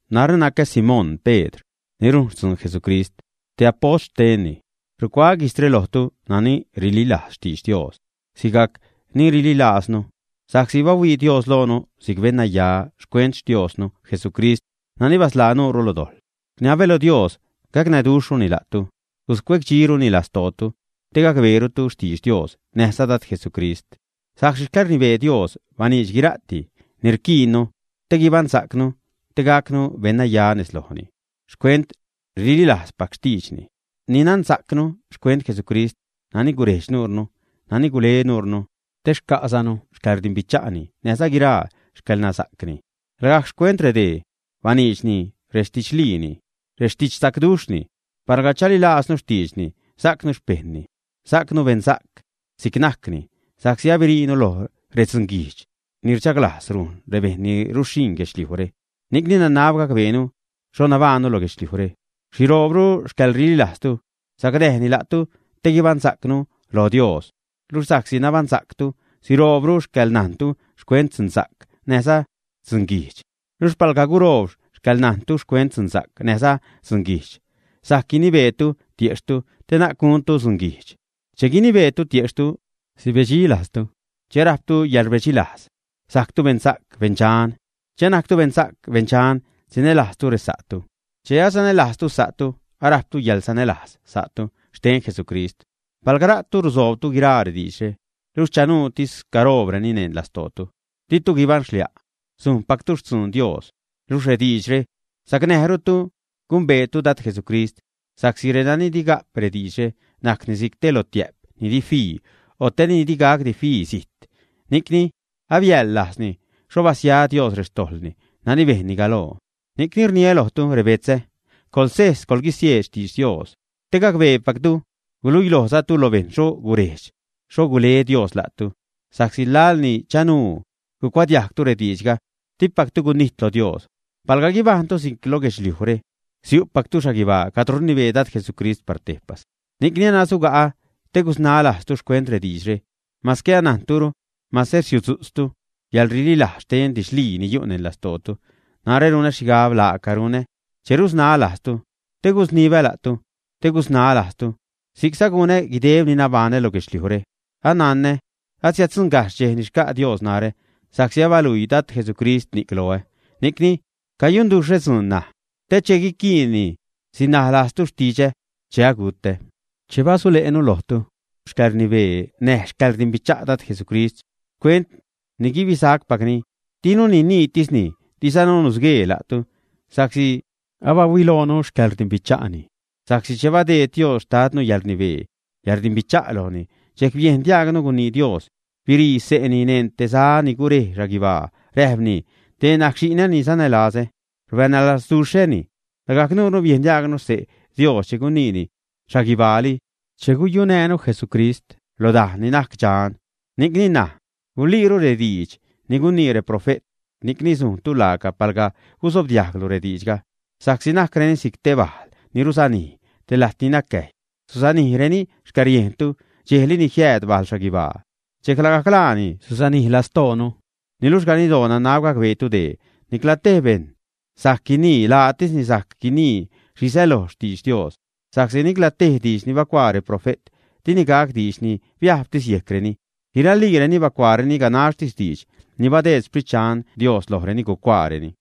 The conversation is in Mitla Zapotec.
Narä nacä Simón Pedr, ni rujn xtzun Jesucrist, te apost xtenni. Rucuaä guijtzre lojtu nani rililajz xtidx Dios sigajc ni rililajznu, sa'csi bahuii Dios loonu si'c beṉnaya xcuent Xtiosnu Jesucrist nani basḻaa nuurnu lo dojḻ. Rniabä lo Dios gacnäduxhruni la'tu, guscuecdxiruni lastootu, te gacbeerutu xtidx Dios näjza Dad Jesucrist. Sa'csi xcäḻrnibee Dios baniidx guira'ti ni rquiinnu te guibaṉsa'cnu, te gacnu beṉnaya nez lojni, xcuent rililajzpac xtiidxni ni nansa'cnu xcuent Jesucrist nani gurejdx nuure, nani gule nuure te xca'zanu xcäḻrdimbicha'ni, näjza guiraa xcäḻnansa'cni. Lagajc xcuent redee baniidxni rextidxliini, rextidxsacduxhni. Palga chalilajznu xtiidxni, sajcnu xpejṉni, sajcnu beṉsa'c si'c najcni sa'csi abiriinu loj redzunguijdx ni chaglajz rujn rebejṉ ni ruxhiṉ guedxliujre. Ni'cni nanab gacbeenu xho nabaṉnu lo guedxliujre. Siroobru xcäḻrililajztu sacnäjni la'tu te guibaṉsa'cnu lo Dios; luxh sa'csi nabaṉsa'ctu, siroobru xcäḻnajntu xcuent dzunsa'c näjza dzunguijdx. Luxh palga guroob xcäḻnajntu xcuent dzunsa'c näjza dzunguijdx sajc guinibeetu tiejxhtu te na'c guntu dzunguijdx. Che guinibeetu tiejxhtu, sibedxi lajztu. Che arajptu yäḻrbedxilajz, sajctu beṉsa'c, beṉdxan. Che anajctu beṉsa'c, beṉdxan, sinälajztu resa'tu; che asanälajztu sa'tu, arajptu yäḻsanälajz sa'tu xten Jesucrist. Palga la'tu rusoobtu guiraa rediidxre, luxh chanuutis caroobreni neṉ lastootu, ditu guibaṉxlia'; sujnpactu xtzun Dios, luxh rediidxre sacnäjrutu gumbeetu Dad Jesucrist. Sa'csi renani di ga'p rediidxre, najcni si'c te lotiä'p ni di fii, o te ni di gacdi fii zijt, ni'cni abiäḻlajzni xho basia Dios rextojḻni nani bejnni galoo. Ni'cni rniä lojtu rebetzä, coḻsejs, coḻguisieed xtidx Dios te gacbeepactu, guluilojzatu lo bejṉ xho gurejdx, xho gule Dios la'tu, sa'csi laḻ ni chanuu gucuadiajgtu rediidxga, dipactu gunijt lo Dios. Palga guibajṉtu si'c lo guedxliujre, siu'pactu xhaguibaa cadro rnibee Dad Jesucrist par tejpas. Ni'cni anasuga'ä te gusnaä lajztu xcuent rediidxre, mase anajntureni, mase risutzu'tztu yäḻrililajz xten didxlii ni yu' neṉ lastootu. Narä runä xhigab laaca runä che rusnaä lajztu, te gusnibä la'tu, te gusnaä lajztu. Si'cza gunä guideb ni nabaṉä lo guedxliujre. Ananä asiäddzuṉgajxh dxej ni xca' Dios narä, sa'csi abaluii Dad Jesucrist ni'c loä. Ni'cni cayunduxhä dzuun ṉaj, te che guiquiinni sinaj lajztu xtidxä che agu'tä. Che basule'nu lojtu xcäḻrnibee näj xcäḻrdimbicha' Dad Jesucrist, xcuent ni guibisacpacni, dinu niniitisni, dizanu nusguee la'tu, sa'csi abahuiloonu xcäḻrdimbicha'ni. Sa'csi che badeed Dios xtadnu yäḻrnibee, yäḻrdimbicha' lojni, dxejc biejn diajgnu gunii Dios, birii xse'ni neṉ te za ni gurej xhaguibaa, räjpni: “Dee najc xi'nä ni sanälazä, rbanälazduxhäni.” Lagajc nuure biejn diajgnu xse' Dios che guniini xhaguibaali che guyunäjnu Jesucrist lo dajn ni najc dxan. Ni'cni ṉaj guliiru rediidx ni gunii reprofe't. Ni'cni sujntu laaca palga gusobdiajglu rediidxga, sa'csi najcreni si'c te bajl ni rusanij te lajt ni nacäjy, susanijreni xcäriejntu dxejli ni jiääd bajl xhaguibaa. Dxejc lagajc laani susanij lastoonu. Niluxh ganiddoo nanab gacbeetu dee: nicla tej bejṉ sajc guinii laatisni sajc guinii xhi säloj xtidx Dios, sa'csi nicla tej diidx ni bacuaa reprofe't dini gac diidx ni biajbtis yejcreni. Guiraliireni bacuaareni ganaxtis diidx ni badeed Xprit Dxan Dios lojreni gucuaareni.